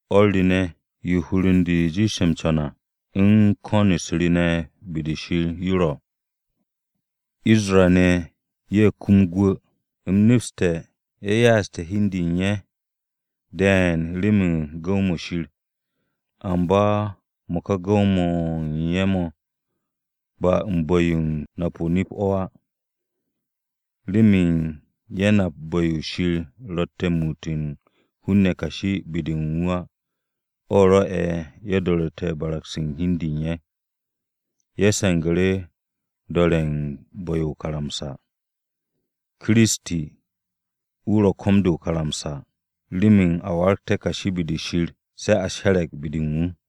O̱r re ne̱, yo hur u̱n de jiishe̱ m-co̱n à, u̱n ko̱n-u̱s re ne̱ be-de Shir yo ro̱, Isra-ne̱ ye̱ kum gwu̱. U̱m nepste̱ ye̱ ya'aste̱ hi u̱n de u̱n ye̱ de̱e̱n remen gu̱w-mo̱ Shir. Amba mo̱ ka gu̱w-mo̱ u̱n ye̱ mo̱ ba u̱n bu̱-yo u̱n nap-o nip-o̱ á. Remen ye̱ nap bu̱-yo Shir ro̱tte̱ u̱n muut u̱n hun-ne̱ kashi be-de u̱n wu̱ á, o̱ rwo̱'e̱ ye̱ do̱ru̱te̱ barag-se u̱n hi u̱n de u̱n ye̱. Ye̱ se̱ngu̱ru̱ m-do̱re̱ u̱n bu̱-yo o-karamsa. Kiristi, wu̱ ro̱ ko̱m-de o-karamsa, remen a waragté̱ kashi be-de Shir, se̱ a she̱re̱g be-de u̱n wu̱.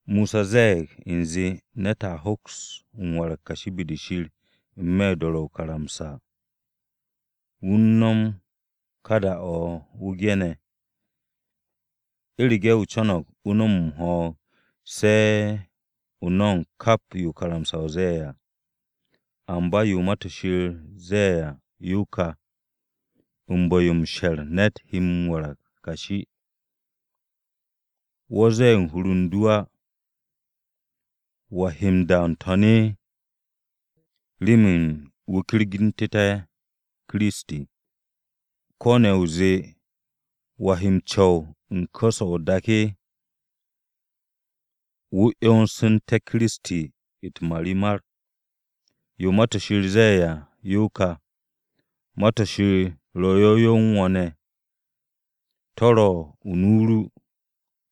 Mosa ze̱e̱g u̱nze ne̱t a hoks m-warag kashi be-de Shir n-me̱ u̱n do̱ro̱tte̱ o-karamsa. Wu̱ u̱n no̱m kaane̱ da-o̱ wu̱ ge̱ne̱ à, “U̱rege̱ o co̱no̱g o no̱m m-ho̱o̱g, se̱ o no̱mo̱g kap yo karamsa-o ze̱e̱ à.” Amba yo Ma-to̱ Shir ze̱e̱ à yo ka, u̱n bu̱-yo m-she̱r ne̱t he m-warag kashi. “Wo̱ zee u̱n hur u̱n du á, ‘¿Wa he m-da n-To̱n?’” (Remen wu̱ kyergu̱ntu̱té̱ Kiristi) ko̱ ne̱ o zee, “¿Wa he m-co̱w u̱n ku̱s-o̱ o-dak?” (Wu̱ 'yonsu̱nte̱ Kiristi u̱t-marimar). Yo Ma-to̱ Shir ze̱e̱ à, yo ka: “Ma-to̱ Shir ro̱ yow yow u̱n wo̱ ne̱, to̱ ro̱ u̱n nu ru,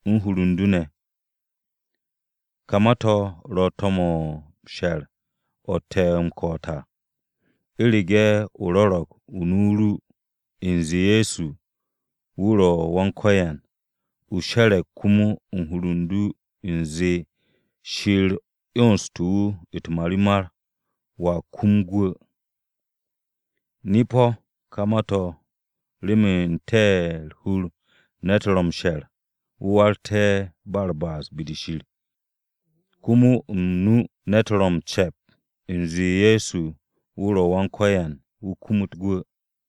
u̱n hur u̱n du ne̱.” Ka ma-to̱ ro̱ to̱m-o̱ m-she̱r o̱ te̱ m-ko̱'o̱t à. U̱rege̱ o rwo̱ro̱g u̱n nu-o ru u̱nze Ye̱so wu̱ ro̱ Wan-Ko̱yan, o she̱re̱g komo u̱n hur u̱n du u̱nze Shir 'yonste̱ wu̱ u̱t-marimar, wo̱a kum gwu̱. Nip-o̱ ka ma-to̱ remen n-te̱ u̱r-hur ne̱t ro̱ m-she̱r wu̱ waragté̱ ba u̱r-ba'as be-de Shir, komo o-nu ne̱t ro̱ m-ce̱p u̱nze Ye̱so wu̱ ro̱ Wan-Ko̱yan wu̱ kumut gwu̱.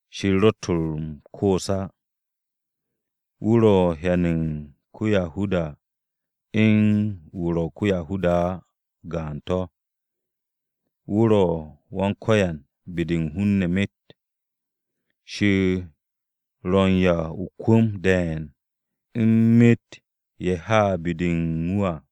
Shir ro̱tt m-koos á. Wu̱ ro̱ m-hyan ko-Yahuda u̱n wu̱ ro̱ ko-Yahuda á, gaan-to̱. Wu̱ ro̱ Wan-Ko̱yan be-de u̱n hun-ne̱ myet. Shir ro̱ m-'ya o-kwu̱m de̱e̱n u̱n myet ye̱ ha be-de u̱n wu̱ à.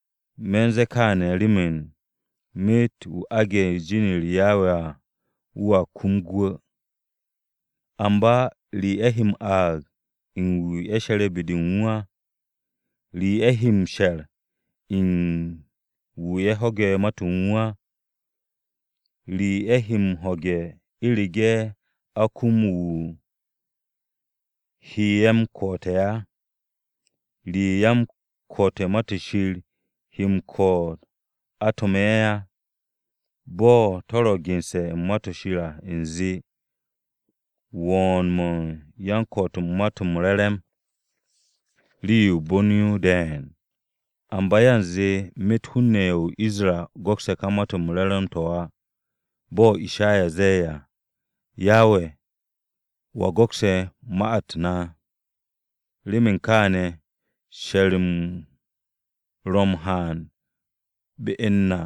Me̱ u̱n ze̱e̱ kaane̱ remen, “Myet wu̱ aage̱ u̱n jin-u̱r Yawe à, wu̱a kum gwu̱.” ¿Amba re ye̱ he m-aag u̱n wu̱ ye̱ she̱re̱ be-de u̱n wu̱ á? ¿Re ye̱ he m-she̱r u̱n wu̱ ye̱ ho̱ge̱ ma-to̱ u̱n wu̱ á? ¿Re ye̱ he m-ho̱ge̱ u̱rege̱ a kum wu̱ he ye̱ m-ko̱'o̱te̱ á? ¿Re yan-ko̱'o̱t u̱n Ma-to̱ Shir he m-ko̱'o̱t a to̱m ye̱ á? Bo̱ to̱ ro̱ gense̱ u̱n Ma-to̱ Shir à u̱nze, “Wo̱o̱n-mo̱ u̱n yan-ko̱'o̱t u̱n Ma-to̱ m-Re̱re̱m rii-yo u̱r-bon yo de̱e̱n.” Amba yanze myet hun-ne̱ ye̱ o-Isra go̱kse̱ ka Ma-to̱ m-Re̱re̱m to̱ á. Bo̱ Ishaya ze̱e̱ à, “Yawe, ¿wa go̱kse̱ ma-u̱t na?” Remen kaane̱, she̱r-m ro̱ m-haan be u̱n na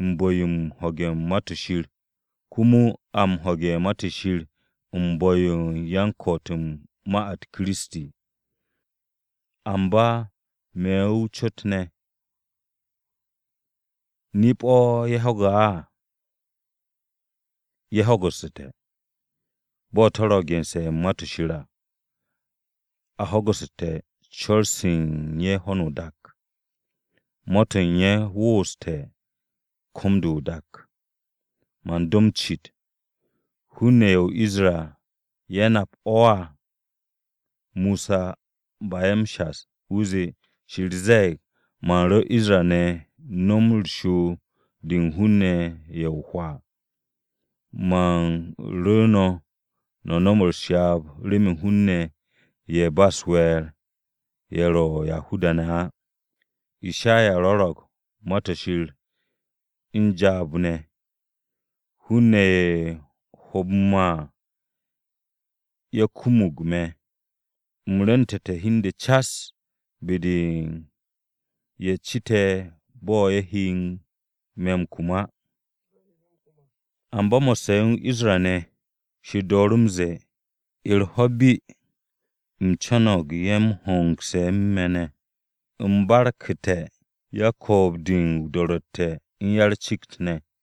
u̱n bu̱-yo u̱n ho̱ge̱ u̱n Ma-to̱ Shir, komo a m-ho̱ge̱ u̱n Ma-to̱ Shir u̱n bu̱-yo u̱n yan-ko̱'o̱t u̱n ma-u̱t Kiristi. Amba me̱ o-cot ne̱, “¿Nip-o̱ ye̱ ho̱ge̱ á?” Ye̱ ho̱gu̱su̱te̱. Bo̱ to̱ ro̱ gense̱ u̱n Ma-to̱ Shir à: “A ho̱gu̱su̱te̱ co̱r-se u̱n ye̱ ho̱no o-dak, Ma-to̱ u̱n ye̱ woose̱ komo ko̱m-de o-dak.” Man do m-cit, “¿Hun-ne̱ ye̱ o-Isra ye̱ nap o̱ á?” Mosa ba'e̱ m-shas, wu̱ zee, Shir ze̱e̱g: “Man ru̱ Isra-ne̱ nom u̱r-shoob de u̱n hun-ne̱ ye̱ o-hwaa. Man ru̱ no̱ no̱m u̱s-ryaab remen hun-ne̱ ye̱ u̱n ba u̱s-we̱e̱r, ye̱ ro̱ Yahuda-ne̱ á.” Ishaya rwo̱ro̱g Ma-to̱ Shir u̱n jaab ne̱: “Hun-ne̱ ye̱ ho̱o̱bu̱ me̱ á, ye̱ kumug me̱. U̱m rwu̱ntu̱te̱ hi u̱n de cas be-de u̱n ye̱ cite̱ bo̱ ye̱ he me̱ m-kum á.” Amba mo̱sse̱ o-Isra-ne̱, Shir dooru̱ m-ze̱e̱, “U̱r-ho̱ bi, u̱m co̱no̱g ye̱ m-hongse̱ u̱n me̱ ne̱, u̱m barku̱te̱ yan-ko̱o̱b-de o-do̱ro̱tte̱ u̱n ya-u̱r-cikt ne̱.”